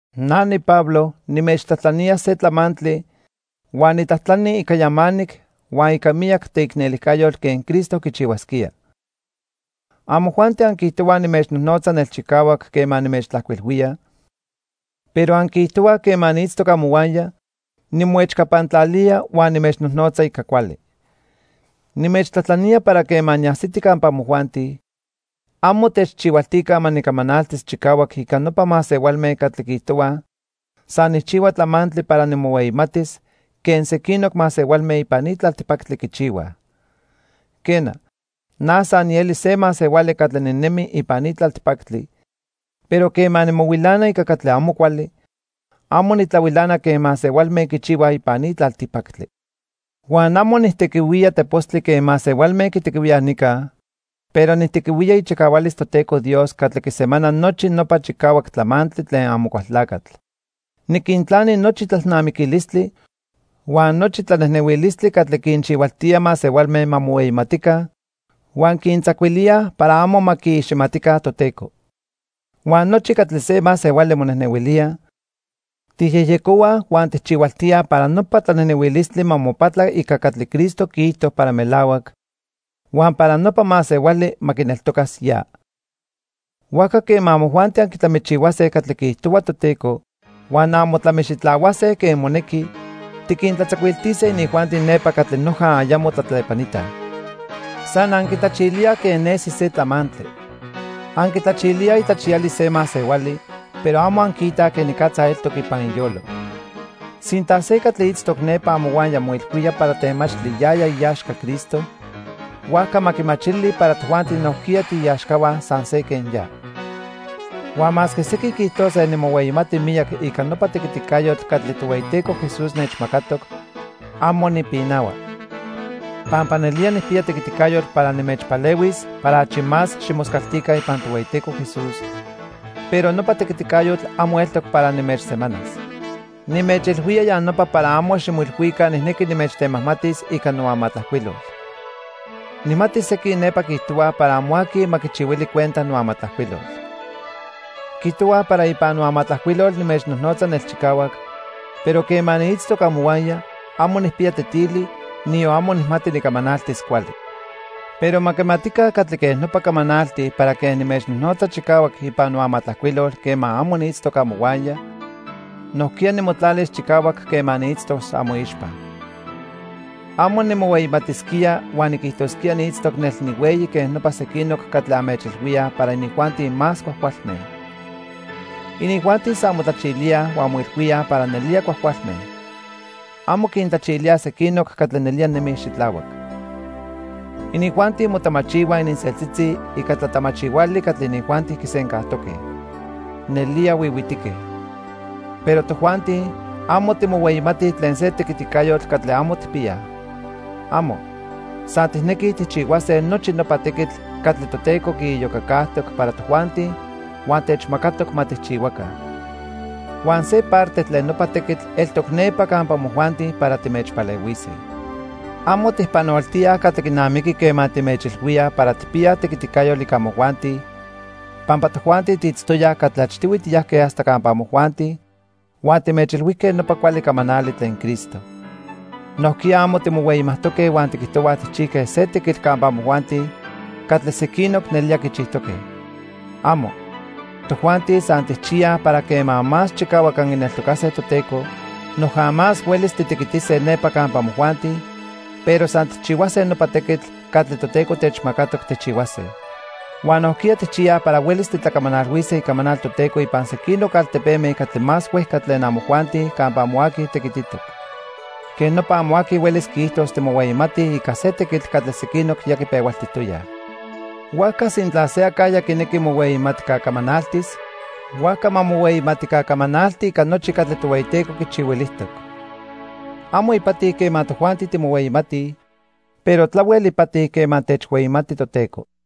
Na niPablo nimechtlajtlanía se tlamantli huan nitlajtlani ica yamanic huan ica miyac teicnelijcayotl quen Cristo quichihuasquía. Amojuanti anquiijtohuaj nimechnojnotza nelchicahuac quema nimechtlajcuilhuía, pero anquiijtohuaj quema niitztoc amohuaya, nimoechcapantlalía huan nimechnojnotza ica cuali. Nimechtlajtlanía para quema niajsiti campa amojuanti, amo techchihualtica ma nicamanaltis chicahuac ica nopa masehualme catli quiijtohuaj san nijchihua tlamantli para nimohueyimatis quen sequinoc masehualme ipan ni tlaltipactli quichihuaj. Quena, na san nieli se masehuali catli ninemi ipan ni tlaltipactli, pero quema nimohuilana ica catli amo cuali, amo nitlahuilana quen masehualme quichihuaj ipan ni tlaltipactli. Huan amo nijtequihuía tepostli quen masehualme quitequihuíaj nica, pero nijtequihuía ichicahualis Toteco Dios catli quisemana nochi nopa chicahuac tlamantli tlen Amocualtlacatl. Niquintlani nochi tlalnamiquilistli huan nochi tlanejnehuilistli catli quinchihualtíaj masehualme ma mohueyimatica huan quintzacuilíaj para amo ma quiiximatica Toteco. Huan nochi catli se masehuali monejnehuilía, tijyejyecohuaj huan tijchihualtíaj para nopa tlanejnehuilistli ma mopatla ica catli Cristo quiijto para melahuac huan para nopa masehuali ma quineltocas ya. Huajca quema amojuanti anquitlamichihuase catli quiijtohua Toteco huan anmotlamixitlahuase quen monequi, tiquintlatzacuiltise inijuanti nepa catli noja ayamo tlatlepanitaj. San anquitlachilíaj quen nesi se tlamantli. Anquitlachilíaj itlachiyalis se masehuali, pero amo anquiitaj quenicatza eltoc ipan iyolo. Sintla se catli itztoc nepa amohuaya moilhuía para temachtli yaya iaxca Cristo, huajca ma quimachili para tojuanti nojquiya tiiaxcahua san se quen ya. Huan masque sequin quiijtose nimohueyimati miyac ica nopa tequiticayotl catli Tohueyiteco Jesús nechmacatoc, amo nipinahua. Pampa nelía nijpiya tequiticayotl para nimechpalehuis para achi más ximoscaltica ipan Tohueyiteco Jesús, pero nopa tequiticayotl amo eltoc para nimechsemanas. Nimechilhuía ya nopa para amo ximoilhuica nijnequi nimechtemajmatis ica noamatlajcuilol. Nijmati sequin nepa quiijtohuaj para amo aqui ma quichihuili cuenta noamatlajcuilol. Quiijtohuaj para ipan noamatlajcuilol nimechnojnotza nelchicahuac, pero quema niitztoc amohuaya, amo nijpiya tetili, niyon amo nijmati nicamanaltis cuali. Pero ma quimatica catli quej nopa camanaltij para quen nimechnojnotza chicahuac ipan amatlajcuiloli quema amo niitztoc amohuaya, nojquiya nimotlalis chicahuac quema niitztos amoixpa. Amo nimohueyimatisquía huan niquijtosquía niitztoc nel nihueyi quen nopa sequinoc catli anmechilhuíaj para inijuanti más cuajcualme. Inijuanti san motlachilíaj huan moilhuíaj para nelía cuajcualme. Amo quintlachilíaj sequinoc catli nelía nemij xitlahuac. Inijuanti motamachihuaj ininseltzitzi ica tlatamachihuali catli inijuanti quisencajtoque. ¡Nelía huihuitique! Pero tojuanti, amo timohueyimatij tlen se tequiticayotl catli amo tijpiyaj. ¡Amo! San tijnequij tijchihuase nochi nopa tequitl catli Toteco quiiyocacajtoc para tojuanti huan techmacatoc ma tijchihuaca. Huan se parte tlen nopa tequitl eltoc nepa campa amojuanti para timechpalehuise. Amo tijpanoltíaj catli quinamiqui quema timechilhuíaj para tijpiyaj tequiticayotl ica amojuanti, pampa tojuanti tiitztoyaj catli achtihui tiyajque hasta campa amojuanti huan timechilhuijque nopa cuali camanali tlen Cristo. Nojquiya amo timohueyimajtoque huan tiquijtohuaj tijchijque se tequitl campa amojuanti catli sequinoc nelía quichijtoque. ¡Amo! Tojuanti san tijchiyaj para quema más chicahuac anquineltocase Toteco, noja más huelis titequitise nepa campa amojuanti, pero san tijchihuase nopa tequitl catli Toteco techmacatoc tijchihuase. Huan nojquiya tijchiyaj para huelis titlacamanalhuise icamanal Toteco ipan sequinoc altepeme catli más huejca tlen amojuanti campa amo aqui tequititoc. Quej nopa amo aqui huelis quiijtos timohueyimatij ica se tequitl catli sequinoc ya quipehualtijtoyaj. Huajca sintla se acajya quinequi mohueyimatca camanaltis, huajca ma mohueyimatica camanalti ica nochi catli Tohueyiteco quichihuilijtoc. Amo ipati quema tojuanti timohueyimatij, pero tlahuel ipati quema techhueyimati Toteco.